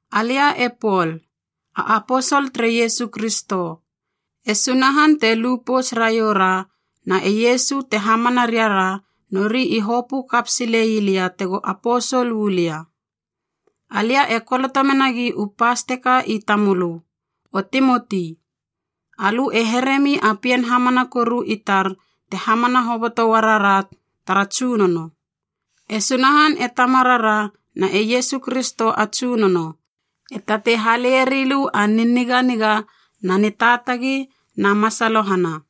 Alia e Pol, a aposol tere Iesu Kristo. E Sunahan te lu pouts raiou ra na e Iesu te hamana riara nori i hopö kap silei lia tego aposol uu lia. Alia e koloto menagi u pas teka i tamölö, O Timoti! Alö e heremi a pien hamana koru i tar te hamana hoboto uarara tara Tsunono. E Sunahan e Tamarara na e Iesu Kristo a Tsunono, e tatei hale rilö a niniganiga na nitaatagi na masalohana.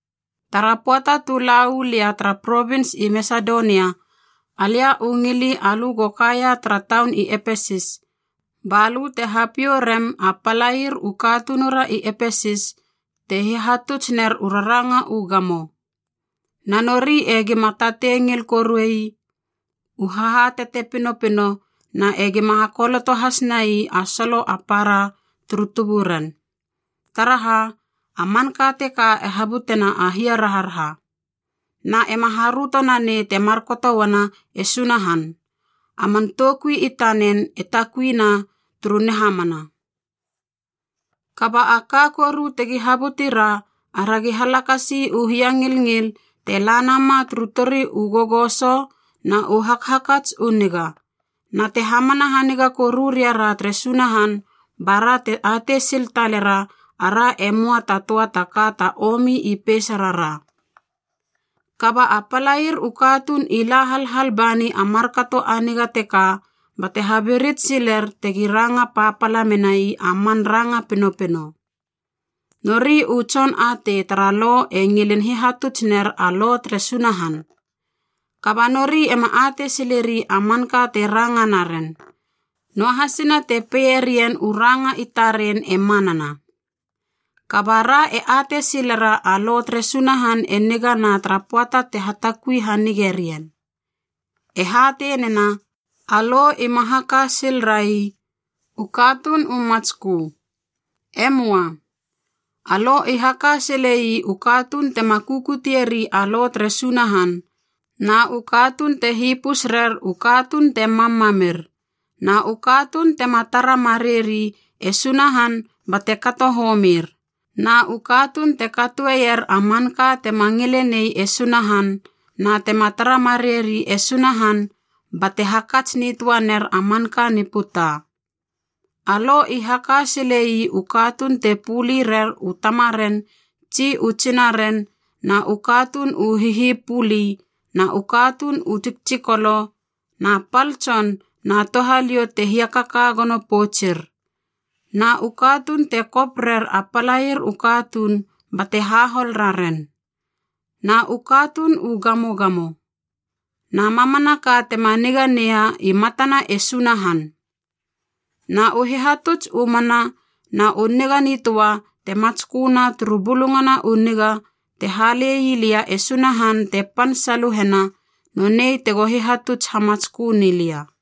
Tara pöata tu la uu lia tara provins i Masedonia, alia u ngili alö go kakaia tara taun i Epesis, ba lö te hapiou rem a palair u katunura i Epesis te hihatuts ner u raranga u gamo. Na nori e gima tatei ngil koruei u hahatate pinopino na e gima hakoloto has nai a solo a para turu tuburen. Taraha, a manka teka e habutena a hiaraharaha. Na ema haröto nanei te markato uana e Sunahan, a man toukui i tanen e takui na turu nihamana. Kaba a ka koru tegi habuti ra, aragi halakasi u hiangilngil te la nama turu tori u gogoso na u hakhakats u niga, na te hamana haniga koru riara tere Sunahan bara te atei sil talera ara e möa ta töa ta ka ta omi i peisarara. Kaba a palair u katuun i la halhal bani a markato a niga teka bate habirits siler tegi ranga papala menai a man ranga pinopino. Nori u tson atei tara Lo e ngilin hihatuts ner a Lo tere Sunahan, kaba nori ema atei sileri a manka te ranga naren, noahasina te peieren u ranga i taren e manana. Kaba ra e atei silera a Lo tere Sunahan e nigana tara pöata te hatakui hanige rien. E hatei nena, a Lo ima haka sil rai u katuun u matskö. E möa. A Lo i haka sile ii u katuun tema kukutieri a Lo tere Sunahan, na u katuun te hipus rer u katuun te mammamir, na u katuun tema tara mareieri e Sunahan bate kato homir, na u katuun te katoeier a manka tema ngilenei e Sunahan na tema tara mareieri e Sunahan bate hakats nitöa ner a manka ni puta. A Lo i haka sile ii u katuun te puli rer u tamaren tsi u tsinaren na u katuun u hihipuli na u katuun u tsiktsikolo na pal tson na touhaliou te hiakaka gono poutsur, na u katuun te kop rer a palair u katuun bate hahol raren, na u katuun u gamogamo. Na mamanaka tema niga neia i matana e Sunahan. Na u hihatuts u mana na u niga nitöa te matsköna turu Bulungana u Niga te halei lia e Sunahan te pan saluhena, nonei tego hihatuts hamatskö ni lia.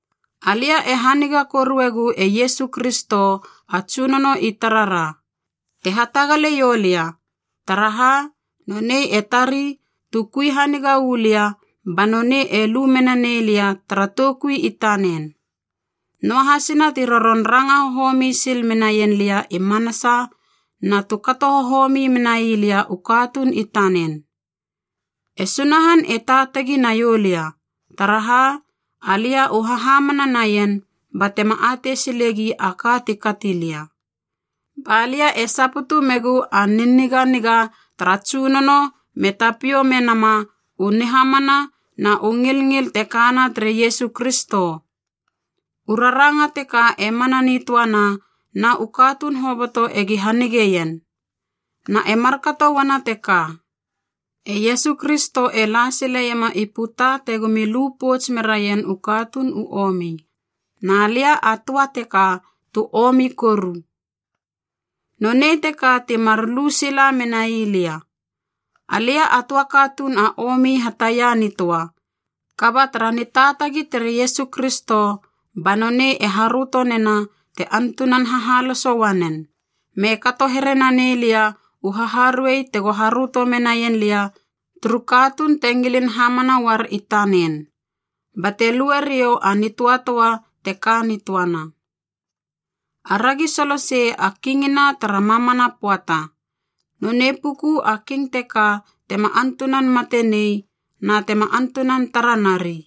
Alia e haniga koruegu e Iesu Kristo a Tsunono i tarara, te hatagale ioulia, taraha nonei e tari tu kui haniga uu lia ba nonei e lu mena nei lia tara toukui i tanen. Noahasina ti roron ranga hohomi sil menaien lia i manasa na tu kato hohomi menai lia u katuun i tanen. E Sunahan e taatagi naiou lia, taraha alia u hahamana naien batema atei silegi a ka ti kati lia. Ba lia e saputu megu a niniganiga tara Tsunono me tapiou menama u nihamana na u ngilngil te kana tere Iesu Kristo. U raranga teka e mana nitöana na u katuun hoboto egi hanigeien. Na e markato uana teka, e Iesu Kristo e la sileiema i puta tegomi lu pouts meraien u katuun u omi. Na lia a töa teka tu omi koru. Nonei teka ti mar lu sila menai lia, alia a töa katuun a omi hataia nitöa, kaba tara nitaatagi tere Iesu Kristo ba nonei e haröto nena te antunan hahaloso uanen, me kato here nanei lia u haharuei tego haröto menaien lia turu katuun te ngilin hamana uar i tanen, bate lue riou a nitöatöa te ka nitöana. Aragi solosei a Kingina tara mamana pöata, nonei puku a King teka tema antunan mate nei na tema antunan tara nari.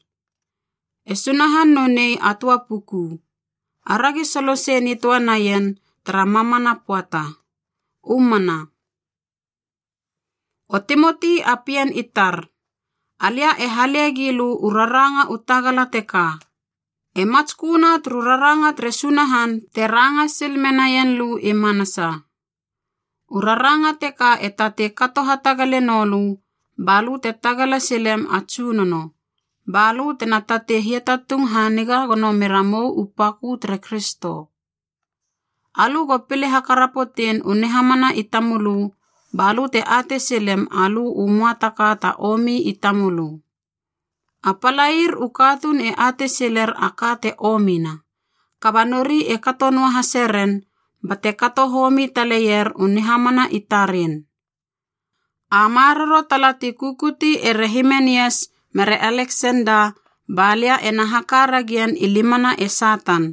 E Sunahan nonei a töa puku. Aragi solosei nitöa naien tara mamana pöata. U mana. O Timoti a pien i tar, alia e hale gilö u raranga u tagala teka. E matsköna turu raranga tere Sunahan te ranga sil menaien lö i manasa. U raranga teka e tatei kato hatagale noulö balö te tagala silem a Tsunono, balö tena tatei hiatatung haniga gono meramou u pakö tere Kristo. Alö go pile hakarapotein u nihamana i tamölö balö te atei silem alö u möa ta ka ta omi i tamölö. A palair u katuun e atei siler a ka te omina, kaba nori e kato noahaseren bate kato homi taleier u nihamana i taren. A maroro tala ti kukuti ere Himenias mere Aleksenda balia ena haka ragien i limana e Satan,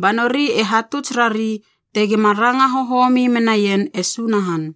ba nori te hatuts rari tegima ranga hohomi menaien e Sunahan.